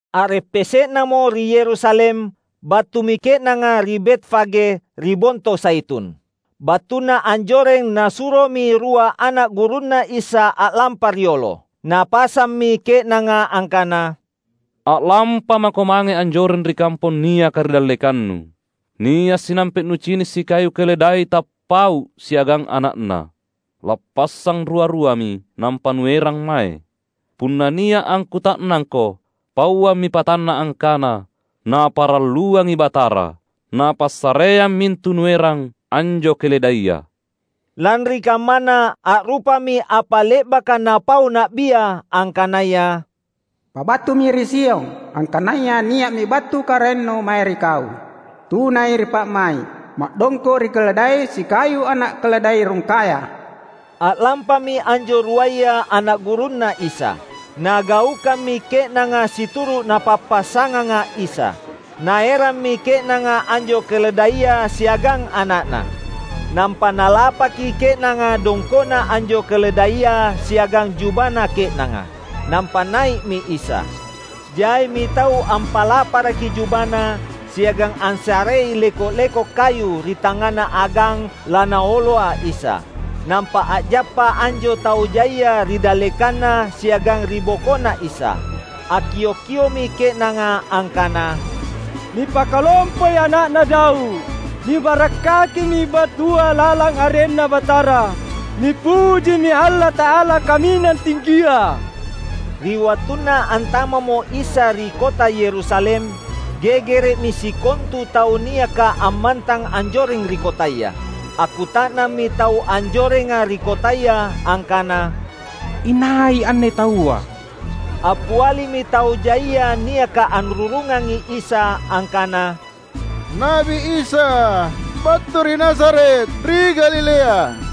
A’reppese’namo ri Yerusalem, battumi ke’nanga ri Betfage, ri Bonto Zaitun. Battuna anjoreng Nasuromi rua ana’ gurunNa Isa a’lampa riolo. Napasammi ke’nanga angkana, "A’lampamako mange anjoreng ri kampong niaka ri dallekannu. Nia’ sinampe’ nucini’ sikayu keledai tappau’ siagang ana’na. Lappassang rua-ruami, nampa nuerang mae. Punna nia’ angkuta’nangko, pauammi patanna angkana, ‘Naparalluangi Batara,’ napassareang mintu nuerang anjo keledaia." Lanri kammana a’rupami apa le’baka napau na’bia angkanaya, "Pabattumi ri Sion, angkanaya nia’mi battu Karaennu mae ri kau. Tunai ri pa’mai’, ma’dongko’ ri keledai sikayu ana’ keledai rungkaya." A’lampami anjo ruaya ana’ gurunNa Isa. Nagaukammi ke’nanga situru’ napappasanganga Isa. Naerammi ke’nanga anjo keledaia siagang ana’na. Nampa nalapakki ke’nanga dongko’na anjo keledaia siagang jubana ke’nanga. Nampa nai’mi Isa. Jaimi tau ampalaparaki jubana siagang ansarei leko’-leko’ kayu ri tangngana agang laNaoloa Isa. Nampa a’jappa anjo tau jaia ri dallekanNa siagang ribokoNa Isa. Akkiok-kio’mi ke’nanga angkana, "Nipakalompoi Ana’na Daud! Nibarakkakimi battua lalang arenNa Batara! Nipujimi Allata’ala Kaminang Tinggia!" Ri wattunna antama’mo Isa ri kota Yerusalem, gegere’mi sikontu tau niaka ammantang anjoreng ri kotaya. Akkuta’nammi tau anjorenga ri kotaya angkana, "Inai anne taua?" Appialimi tau jaia niaka anrurungangi Isa angkana, "Na’bi Isa, battu ri Nazaret, ri Galilea."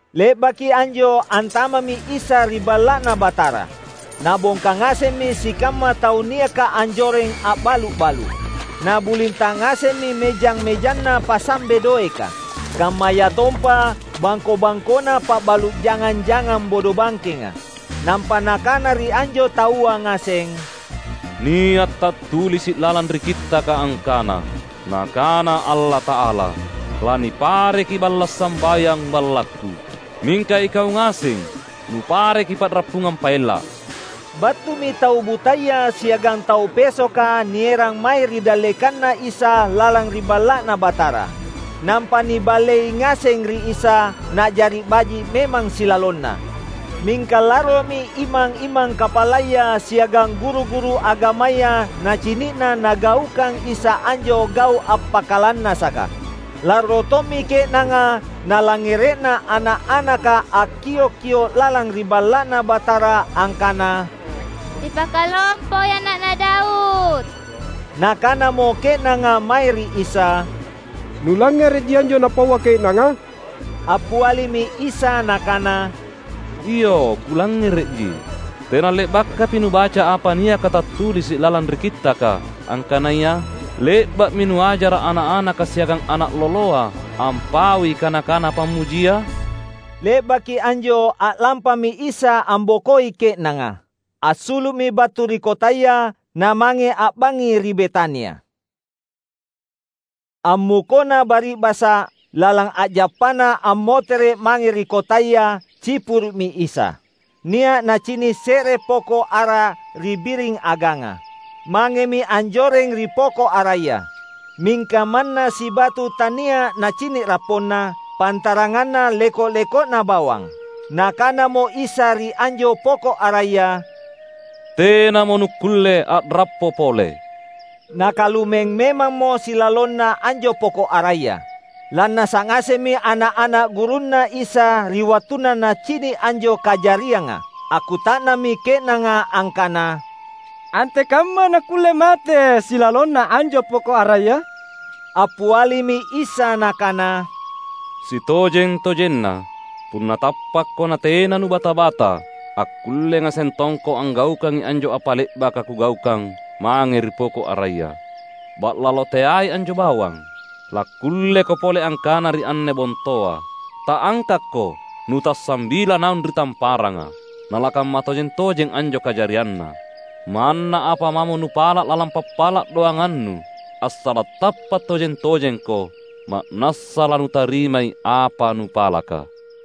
Le’baki anjo antama’mi Isa ri Balla’Na Batara. Nabongka ngasemmi sikamma tau niaka anjoreng a’balu’-balu’. Nabulinta’ ngasemmi mejang-mejanna pasambe doeka, kammayatompa bangko-bangkona pabalu’ jangang-jangang bodobangkenga. Nampa Nakana ri anjo taua ngaseng, "Nia’ tattulisi’ lalang ri Kittaka angkana, Nakana Allata’ala, ‘Lanipareki balla’ sambayang BallakKu.’ Mingka ikau ngaseng nupareki pa’rappungang paella’!" Battumi tau butaya siagang tau pesoka nierang mae ri dallekanNa Isa lalang ri Balla’Na Batara. Nampa niballei ngaseng ri Isa, na’jari baji’ memang silalonna. Mingka larromi imang-imang kapalaya siagang guru-guru agamaya nacini’na Nagaukang Isa anjo gau’ appakalannasaka. Larro tommi ke’nanga nalangngere’na ana’-anaka akkiok-kio’ lalang ri Balla’Na Batara angkana, "Nipakalompoi Ana’na Daud!" Nakanamo ke’nanga mae ri Isa, "Nulangngere’ji anjo napaua ke’nanga?" Appialimi Isa Nakana, "Iyo, Kulangngere’ji. Tena le’bakapi nubaca apa niaka tattulisi’ lalang ri Kittaka angkanaya, ‘Le’ba’mi nuajara’ ana’-anaka siagang ana’ loloa ampaui kana-kana pammujia’?" Le’baki anjo a’lampami Isa ambokoi ke’nanga. Assulu’mi battu ri kotaya, namange a’bangngi ri Betania. Ammukona bari’basa’, lalang a’jappana ammotere’ mange ri kotaya cipuru’mi Isa. Nia’ nacini’ se’re poko’ ara ri biring aganga. Mangemi anjoreng ri poko’ araya. Mingka manna sibatu tania’ Nacini’ rapponna pantaranganna leko-leko’na bawang. Nakanamo Isa ri anjo poko’ araya, "Tenamo nukkulle a’rappo pole!" Nakalumeng memammo silalonna anjo poko’ araya. Lannasa’ ngasemmi ana’-ana’ gurunNa Isa ri wattunna nacini’ anjo kajarianga. Akkuta’nammi ke’nanga angkana, "Antekamma nakkulle mate silalonna anjo poko’ araya?" Appialimi Isa Nakana, "Sitojeng-tojenna, punna tappakko natena nubata-bata, akkulle ngaseng tongko anggaukangi anjo apa le’baka Kugaukang mange ri poko’ araya. Ba’lalo teai anjo bawang. Lakkulleko pole angkana ri anne bontoa, ‘Ta’angkakko, nutassambila naung ri tamparanga’; nalakamma tojeng-tojeng anjo kajarianna. Manna apa mamo nupala’ lalang pappala’ doangannu assala’ tappa’ tojeng-tojengko, ma’nassa lanutarimai apa nupalaka."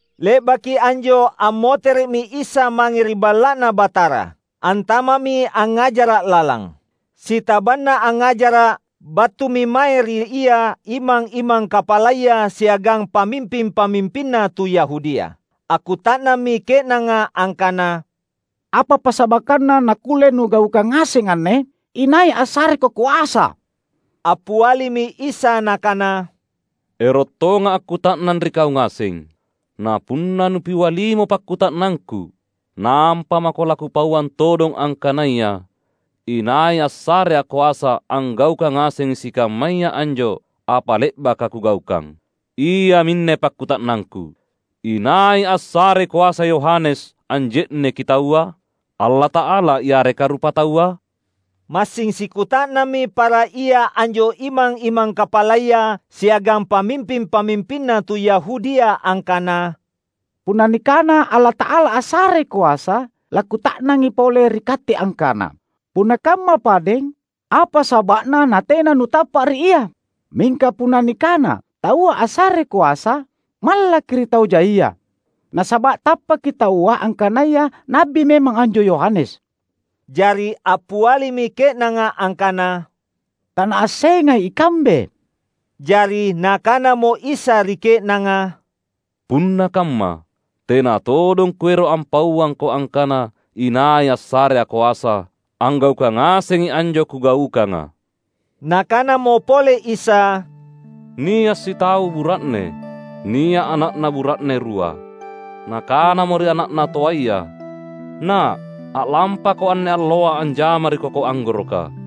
Le’baki anjo ammotere’mi Isa mange ri Balla’Na Batara. Antama’mi angngajara’ lalang. Sitabanna angngajara’, battumi mae ri Ia imang-imang kapalaya siagang pamimping-pamimpinna tu Yahudia. Akkuta’nammi ke’nanga angkana, "Apa passabakkanna nakkulle Nugaukang ngaseng anne? Inai assareKo koasa?" Appialimi Isa Nakana, Ero’ tongA’ akkuta’nang ri kau ngaseng. Na punna nupialimo pakkuta’nangKu, nampa mako laKupauang todong angkanaya inai assareA’ koasa anggaukang ngasengi sikammaya anjo apa le’baka Kugaukang. Iaminne pakkuta’nangKu, "Inai assarei koasa Yohanes anje’neki taua? Allata’ala yareka rupataua?" Massing sikuta’nammi para ia anjo imang-imang kapalaya siagang pamimping-pamimpinna tu Yahudia angkana, "Punna nikana ‘Allata’ala assarei koasa,’ lakkuta’nangi pole ri katte angkana, ‘Punna kamma padeng, apa saba’na natena nutappa’ ri ia?’ Mingka punna nikana, ‘Taua assarei koasa,’ mallakki’ ri tau jaia, nasaba’ tappaki taua angkanaya na’bi memang anjo Yohanes." Jari appialimi ke’nanga angkana, "Tanaassengai ikambe." Jari Nakanamo Isa ri ke’nanga, "Punna kamma tena todong Kuero’ ampauangko angkana inai assareA’ koasa anggaukang ngasengi anjo Kugaukanga." Nakanamo pole Isa, "Nia’ sitau bura’ne, nia’ ana’na bura’ne rua. Nakanamo ri ana’na toaya, ‘Na’, a’lampako anne alloa anjama ri koko anggoroka.’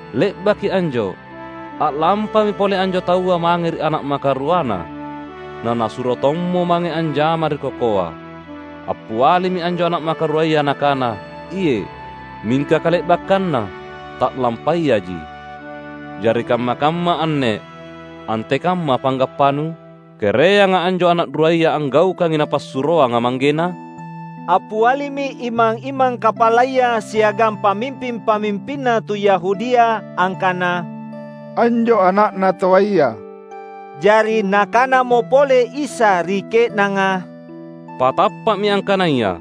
Le’baki anjo a’lampami pole anjo taua mange ri ana’ makaruana, nanasuro tommo mange anjama ri kokoa. Appialimi anjo ana’ makaruaya nakana, ‘Iye’,’ Mingka kale’bakkanna ta’lampayaji. Jari kamma-kamma anne antekamma panggappanu? Kereanga anjo ana’ ruaya anggaukangi napassuroanga manggena?" Appialimi imang-imang kapalaya siagang pamimping-pamimpinna tu Yahudia angkana, "Anjo ana’na toaya." Jari Nakanamo pole Isa ri ke’nanga, "Patappa’mi angkanaya: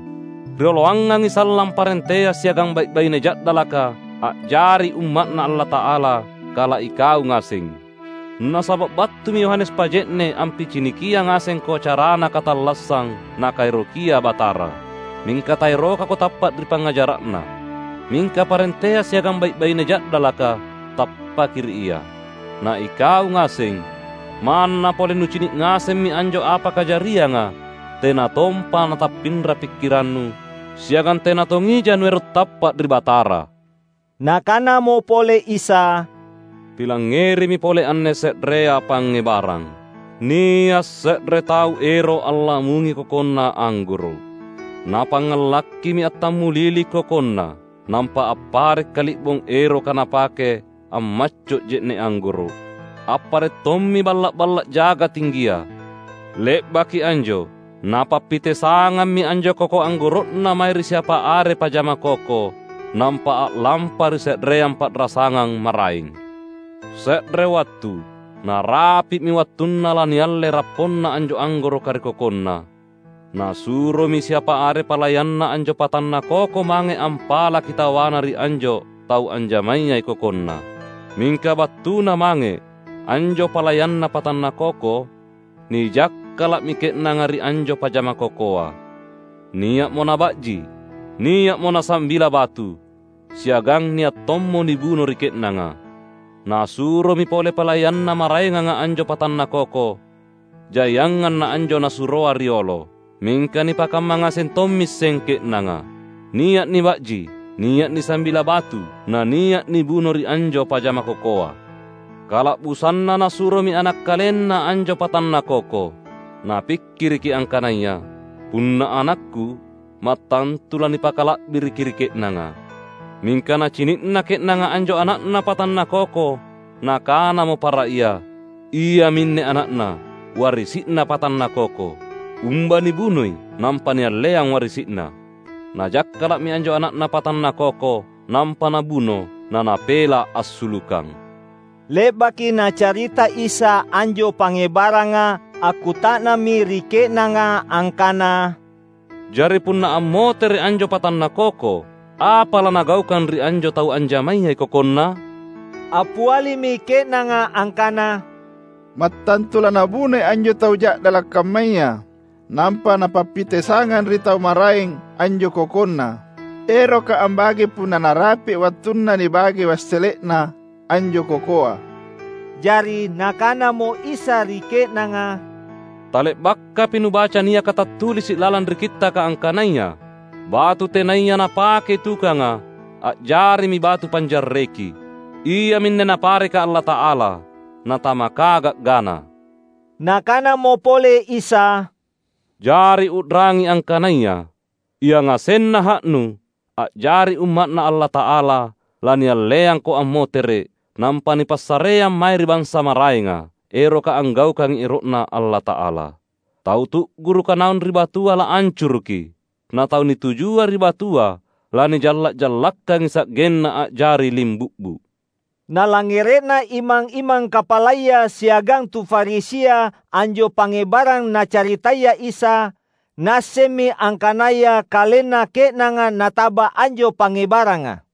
Rioloangangi sallang parentea siagang bai’-baine ja’dalaka a’jari umma’Na Allata’ala kala ikau ngaseng. Nasaba’ battumi Yohanes Paje’ne’ ampicinikiang ngasengko carana katallassang Nakaerokia Batara, mingka taerokako tappa’ ri pangngajara’na; mingka parentea siagang bai’-baine ja’dalaka tappaki ri ia. Na ikau ngaseng, manna pole nucini’ ngasemmi anjo apa kajarianga tena tompa natappinra pikkirannu siagang tena tongija nuero’ tappa’ ri Batara." Nakanamo pole Isa, "Pilangngerimi pole anne se’rea pangngebarang. Nia’ se’re tau ero’ allamungi kokonna anggoro’. Napangngalakkimi attammulili kokonna. Nampa appare’ kali’bong eroka napake ammacco’ je’ne’ anggoro’. Appare’ tommi balla’-balla’ jaga tinggia. Le’baki anjo napappitesangammi anjo koko anggoro’na mae ri siapa are pajama koko. Nampa a’lampa ri se’reang pa’rasangang maraeng. Se’re wattu, narapi’mi wattunna lanialle rapponna anjo anggoroka ri kokonna. Nasuromi siapa are palayanna anjo patanna koko mange ampalaki tawana ri anjo tau anjamayai kokonna. Mingka battuna mange anjo palayanna patanna koko, nijakkala’mi ke’nanga ri anjo pajama kokoa. Nia’mo naba’ji, nia’mo nasambila batu, siagang nia’ tommo nibuno ri ke’nanga. Nasuromi pole palayanna maraenganga anjo patanna koko, jaiangang naanjo nasuroa riolo. Mingka nipakamma ngaseng tommiseng ke’nanga. Nia’ niba’ji, nia’ nisambila batu, nania’ nibuno ri anjo pajama kokoa. Kala’busanna nasuromi ana’ kalenna anjo patanna koko. Napikkiriki angkanaya, ‘Punna anakku mattantu lanipakala’biriki ri ke’nanga.’ Mingka nacini’na ke’nanga anjo ana’na patanna koko nakanamo para ia, ‘Iaminne ana’na, warisi’na patanna koko. Umba nibunoi nampa nialleang warisi’na!’ Najakkala’mi anjo ana’na patanna koko, nampa nabuno, nanapela’ assulukang." Le’baki Nacarita Isa anjo pangngebaranga akkuta’nammi ri ke’nanga angkana, "Jari punna ammotere’ anjo patanna koko, apa lanagaukang ri anjo tau anjamayai kokonna?" Appialimi ke’nanga angkana, "Mattantu lanabunoi anjo tau ja’dala’ kammaya. Nampa napappitesangang ri tau maraeng anjo kokonna, eroka ambagei punna narapi’ wattunna nibage wassele’na anjo kokoa." Jari Nakanamo Isa ri ke’nanga, "Tale’bakapi nubaca niaka tattulisi’ lalang ri Kittaka angkanaya, ‘Batu tenaya napakei tukanga a’jarimi batu panjarreki. Iaminne Napareka Allata’ala; natamaka ga’gana!’" Nakanamo pole Isa, "Jari u’rangi angkanaya, yangasenna ha’nu a’jari umma’Na Allata’ala lanialleangko ammotere’, nampa nipassareang mae ri bansa maraenga, eroka anggaukangi ero’Na Allata’ala. [Tau tu'guruka naung ri batua laancuruki; na tau nitujua ri batua lanijalla'-jallakkangi sa'genna a'jari limbu'bu'.]" Nalangngere’na imang-imang kapalaya siagang tu Farisia anjo pangngebarang Nacaritaya Isa, naassemmi angkanaya kalenna ke’nanga nataba anjo pangngebaranga.